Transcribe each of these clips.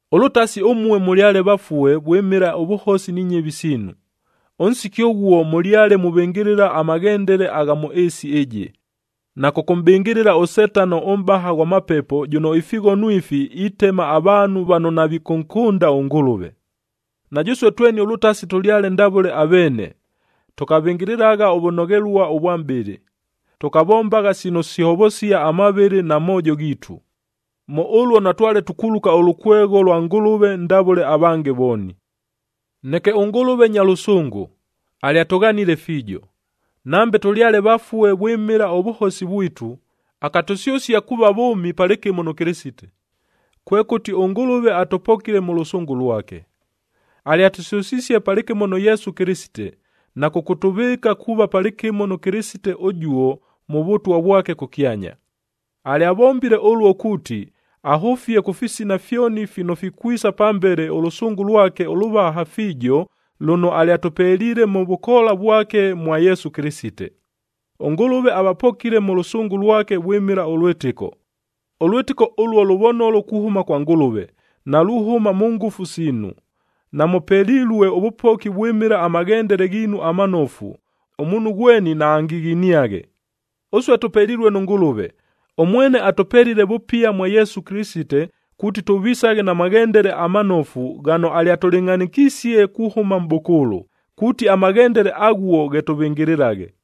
Ʉlʉtasi ʉmue mʉlyale vafue vwɨmɨla ʉvʉhosi ni nyɨvi siinu. Ʉnsiki ʉghuo mʉlyale muvɨngɨlɨla amaghendele agha mʉ ɨɨsi ɨjɨ, na kʉkʉmʼbɨngɨlɨla ʉSetano ʉmʼbaha ghwa mapepo jʉno ifighono ifi itema avaanhu vano navikʉnkʉnda ʉNgʉlʉve. Na jʉsue tweni ʉlʉtasi tʉlyale ndavʉle aveene, tʉkavɨngɨlɨlagha ʉvʉnoghelua ʉvwa mʼbɨlɨ, tʉkavombagha sino sihovosia amavɨlɨ na moojo ghiitu. Mʉ ʉluo natwale tukuluka ʉlʉkwegho lwa Ngʉlʉve ndavʉle avange vooni. Neke ʉNgʉlʉve nya lʉsʉngʉ, alyatʉghanile fiijo. Nambe tʉlyale vafue vwɨmɨla ʉvʉhosi vwitu, akatʉsyʉsia kuuva vʉʉmi palɨkɨmo nʉ Kɨlɨsite, kwekʉti ʉNgʉlʉve atʉpokile mʉ lʉsʉngʉ lwake. Alyatʉsyʉsisie palɨkɨmo nʉ Yesu Kɨlɨsite, na kʉkʉtʉvɨɨka kuuva palɨkɨmo nʉ Kɨlɨsite ʉjuo mʉ Vʉtwa vwake kʉkyanya. Alyavombile ʉluo kuuti, ahʉfie kʉ fisina fyoni fino fikwisa pambele ʉlʉsʉngʉ lwake ʉlʉvaha fiijo lʉno alyatʉpeliile mʉ vʉkoola vwake mwa Yesu Kɨlɨsite. ɄNgʉlʉve avapokile mʉ lʉsʉngʉ lwake vwɨmɨla ʉlwɨtɨko. Ʉlwɨtɨko ʉluo lʉvonolo kuhʉma kwa Ngʉlʉve, naluhʉma mʉ ngʉfu siinu. Namʉpelilue ʉvʉpoki vwɨmɨla amaghendele ghiinu amanofu, ʉmuunhu ghweni naangighiniaghe. Ʉsue tʉpelilue nʉ Ngʉlʉve. Ʉmwene atʉpelile vʉpia mwa Yesu Kɨlɨsite kuuti tʉvisaghe na maghendele amanofu ghano alyatʉlɨngʼhanɨkisie kuhʉma mʼbʉkʉʉlʉ, kuuti amaghendele aghuo ghe tʉvɨngɨlɨlaghe.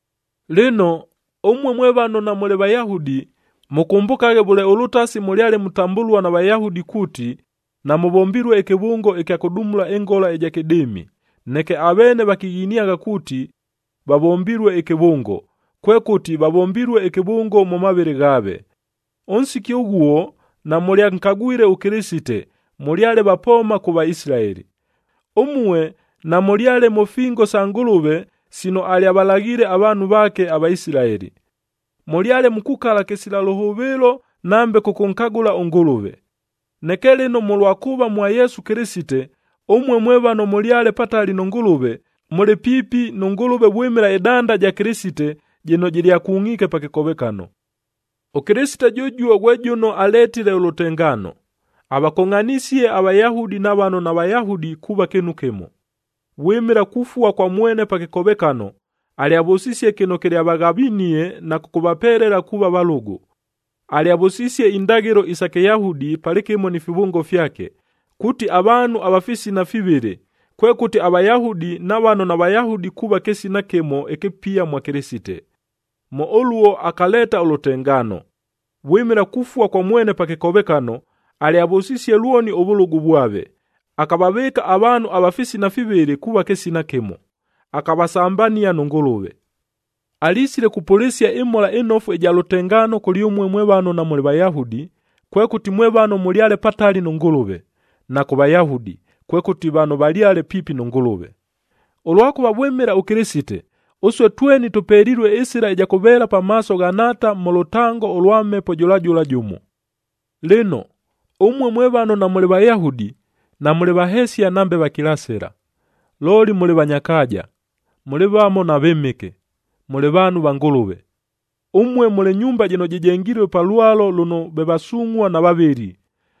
Lɨno, ʉmue mwe vano namʉlɨ Vayahudi, mʉkʉmbʉkaghe vʉle ʉlʉtasi mʉlyale mutambʉlua na Vayahudi kuuti, “Namʉvombilue ɨkɨvʉngo ɨkya kʉdumula ɨngola ɨja kɨdɨɨmi,”a neke aveene vakighiniagha kuuti, “Vavombilue ɨkɨvʉngo,” kwekʉti vavombilue ɨkɨvʉngo mʉ mavɨlɨ ghaave. Ʉnsiki ʉghuo namʉlyankagwile ʉKɨlɨsite, mʉlyale vapooma kʉ Vaisilaeli. Ʉmue namʉlyale mʉ fingob sa Ngʉlʉve sino alyavalaghile avaanhu vaake, aVaisilaeli. Mʉlyale mukukala kɨsila lʉhʉvɨɨlo nambe kʉkʉnkagʉla ʉNgʉlʉve. Neke lɨno mʉlwa kuuva mwa Yesu Kɨlɨsite, ʉmue mwe vano mʉlyale patali nʉ Ngʉlʉve, mʉlɨ piipi nʉ Ngʉlʉve vwɨmɨla ɨdanda ja Kɨlɨsite jɨno jɨlyakungʼiike pa kɨkovekano. ɄKɨlɨsite jʉjuo ghwe jʉno aletile ʉlʉtengaano, avakongʼhanisie aVayahudi na vano naVayahudi kuuva kɨɨnu kɨmo. Vwɨmɨla kufua kwa mwene pa kɨkovekano, alyavʉsisie kɨno kɨlyavaghavinie na kʉkʉvapelela kuuva valʉgʉ. Alyavʉsisie indaghɨlo isa Kɨyahudi palɨkɨmo ni fivʉngo fyake, kuuti avaanhu ava fisina fivɨlɨ, kwekʉti aVayahudi na vano naVayahudi kuuva kɨsina kɨmo ɨkɨpia mwa Kɨlɨsite. Mʉ ʉluo akaleeta ʉlʉtengaano. Vwɨmɨla kufua kwa mwene pa kɨkovekano, alyavʉsisie lwoni ʉvʉlʉgʉ vwave, akavavɨɨka avaanhu ava fisina fivɨlɨ kuuva kɨsina kɨmo, akavasambania nʉ Ngʉlʉve. Alisile kupʉlɨsia ɨMhola ɨNofu ɨja lʉtengaano kʉlyʉmue mwe vano namʉlɨ Vayahudi, kwekʉti mwe vano mʉlyale patali nʉ Ngʉlʉve; na kʉ Vayahudi, kwekʉti vano valyale piipi nʉ Ngʉlʉve. Ʉlwakʉva vwɨmɨla ʉKɨlɨsite, ʉsue tweni tʉpelilue ɨsɨla ɨja kʉveela pamaaso gha Nhaata mʉ lʉtango ʉlwa Mhepo jʉla jʉla jʉmo. Lɨno, ʉmue mwe vano namʉlɨ Vayahudi, namʉlɨ vahesia nambe vakilasɨla. Looli mʉlɨ vanya kaaja, mʉlɨ vamo na vɨmɨke, mʉlɨ vaanhu va Ngʉlʉve. Ʉmue mʉlɨ nyumba jɨno jɨjengilue pa lwalo lʉno ve vasungʼhua na vavɨli,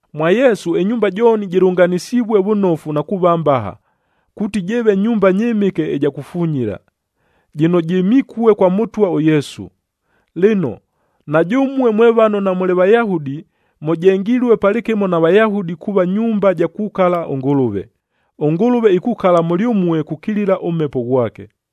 Mwa Yesu ɨnyumba jooni jɨlʉnganɨsivue vʉnofu na kuuva mbaha, kuuti jɨɨve nyumba nyɨmɨke ɨja kufunyila, jɨno jɨmikue kwa Mʉtwa ʉYesu. Lɨno, na jʉmue mwe vano namʉlɨ Vayahudi, mʉjengilue palɨkɨmo na Vayahudi kuuva nyumba ja kukala ʉNgʉlʉve. ɄNgʉlʉve ikukala mʉlyʉmue kukilila ʉMhepo ghwake.